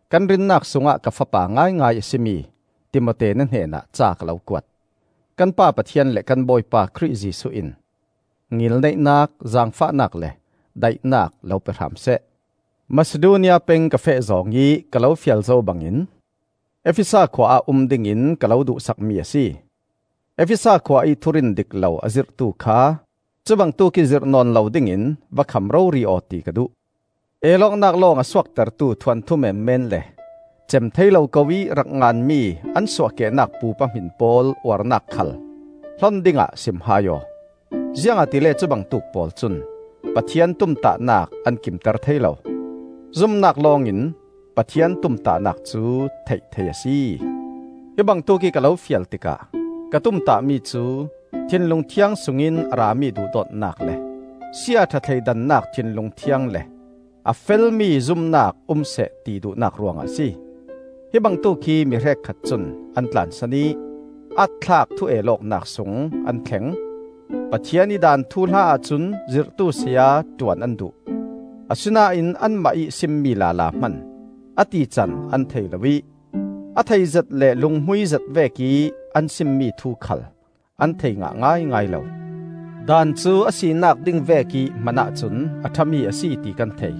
kan rinnak sungah ka fapa ngaingai a si mi Timote na hnenah ca ka lo kuat. Kan Pa Pathian le kan Bawipa Khrih Jesuh in ngilneihnak, zaangfahnak le daihnak lo pe hram seh. Masidonia peng ka feh zawng ih ka lo fial zo bangin Efesa khua ah um dingin ka lo duhsakmi a si. Efesa khua ih thurin dik lo a zirhtu kha cubangtuk ih zirh nawn lo dingin va kham rori aw ti ka duh. El awknak lawng a suaktertu thuanthu menmen le cem thei lo ko ih rak nganmi an suahkehnak pupa hmin pawl uarnak khal hlon dingah sim hai aw. Ziangahtile cubangtuk pawl cun Pathian tumtahnak an kimter thei lo. Zumnak lawngin Pathian tumtahnak cu theih thei a si. Hi bangtuk ih ka lo fial tikah ka tumtahmi cu, thinlung thiang sungin a rami duhdawtnak, le siaṭha thleidannak thinlung thiang le a felmi zumnak um seh ti duhnak ruangah a si. Hi bangtuk hi mi hrekkhat cun an tlansan ih aat-thlak thu-el awknak sung an thleng. Pathian ih daan thuhla ahcun zirhtu saya ṭuan an duh; asinain anmah ih simmi lala hman a tican an thei lo ih a theizet le lunghmuizet vekih an simmi thu khal an thei ngah ngaingai lo. Daan cu a sinak ding vekih hmanah cun a ṭhami a si ti kan thei.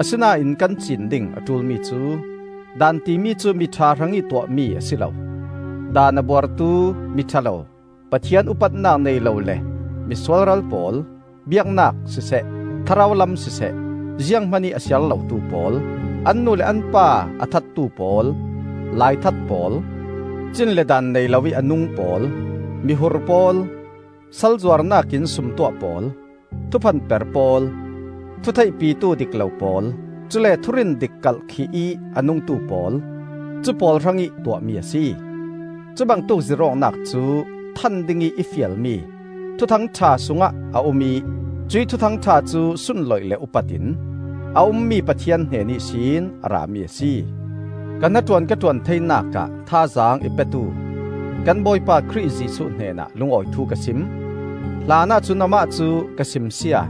Asinain kan ciin ding a ṭulmi cu, daan timi cu miṭha hrangih tuahmi a si lo; daan a buartu, miṭha lo, Pathian upatnak nei lo le mi sualral pawl, biaknak siseh thlarau lam siseh zianghman ih a siar lotu pawl, an nu le an pa a thattu pawl, laithat pawl, cin le daan nei loih a nung pawl, mihur pawl, sal zuarnak in sumtuah pawl, thuphan per pawl, thu theihpitu dik lo pawl, cule thurin dik kalhkih ih a nungtu pawl, cu pawl hrangih tuahmi a si. Cubangtuk zirh awknak cu than dingih i fialmi Thuthang ṭha sungah a um ih cuih Thuthang ṭha cu sunloih le upatin a ummi Pathian hnen ihsin a rami a si. Ka hnaṭuan ka ṭuan theinak ah thazaang i petu kan Bawipa Khrih Jesuh hnenah lungawi thu ka sim. Hlanah cun Amah cu ka simsia,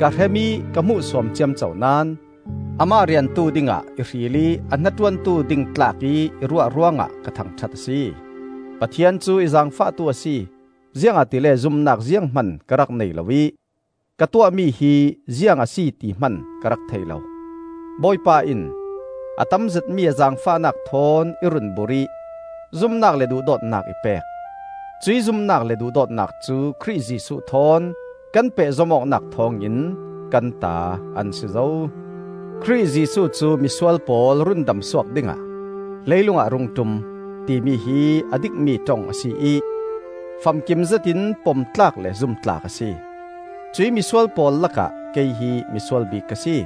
ka hrem ih ka hmuhsuam ciamco naón, Amah riantu dingah i hril ih a hnaṭuantu ding tlak ih i ruah ruangah ka thangṭhat a si. Pathian cu i zaangfahtu a si, ziangahtile zumnak zianghman ka rak nei lo ih ka tuahmi hi ziang a si ti hman ka rak thei lo. Bawipa in a tamzetmi a zaangfahnak thawn i run burh ih zumnak le duhdawtnak i pek. Cuih zumnak le duhdawtnak cu Khrih Jesuh thawn kan pehzom awknak thawngin kan ta an si zo. Khrih Jesuh cu misual pawl rundamsuak dingah leilung ah a rung ṭum, timi hi a dikmi ṭong a si ih famkim zetin pom tlak le zum tlak a si. Cuih misual pawl lakah kei hi misual bik ka si.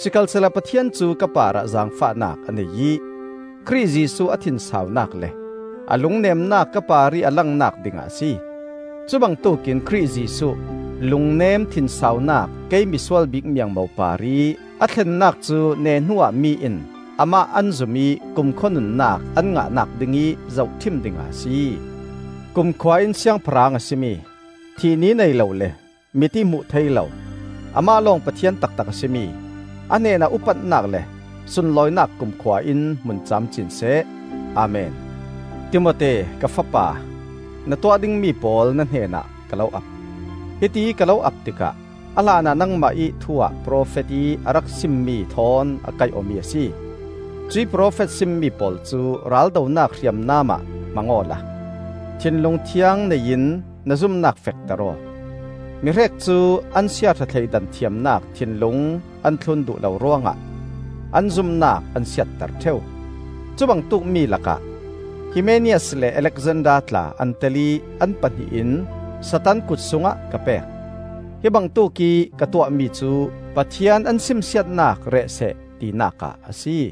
Sikhalsehla Pathian cu ka parah zaangfahnak a nei ih Khrih Jesuh a thinsaunak le a lungnemnak ka parih a langnak dingah a si. Cubangtuk in Khrih Jesuh lungnem thinsaunak kei misual bik miangmo parih a thlennak cu neh hnuah mi in amah an zum ih kumkhua nunnak an ngahnak dingih zohṭhim dingah a si. Kumkhua in Siangpahrang a si mi, thih ni nei lo, le mit-ih hmuh theih lo, amah lawng Pathian taktak a si mi, a hnenah upatnak le sunlawinak kumkhua in hmun camcin seh! Amen. Timote, ka fapa, na tuah dingmi pawl na hnenah ka lo ap. Hitiih ka lo ap tikah a hlanah nangmah ih thu-ah profet ih a rak simmi thawn a kaih awmi a si. Cuih profet simmi pawl cu raldonak hriamnam ah hmang awla, thinlung thiang nei in na zumnak fekter aw. Mihrek cu an siaṭha thleidan thiamnak thinlung an thlun duh lo ruangah an zumnak an siatter ṭheu. Cubangtuk mi lakah Himenaias le Alexander tla an tel ih an pahnih in Satan kut sungah ka pek. Hi bangtuk ih ka tuahmi cu Pathian an simsiatnak reh seh tinak ah a si.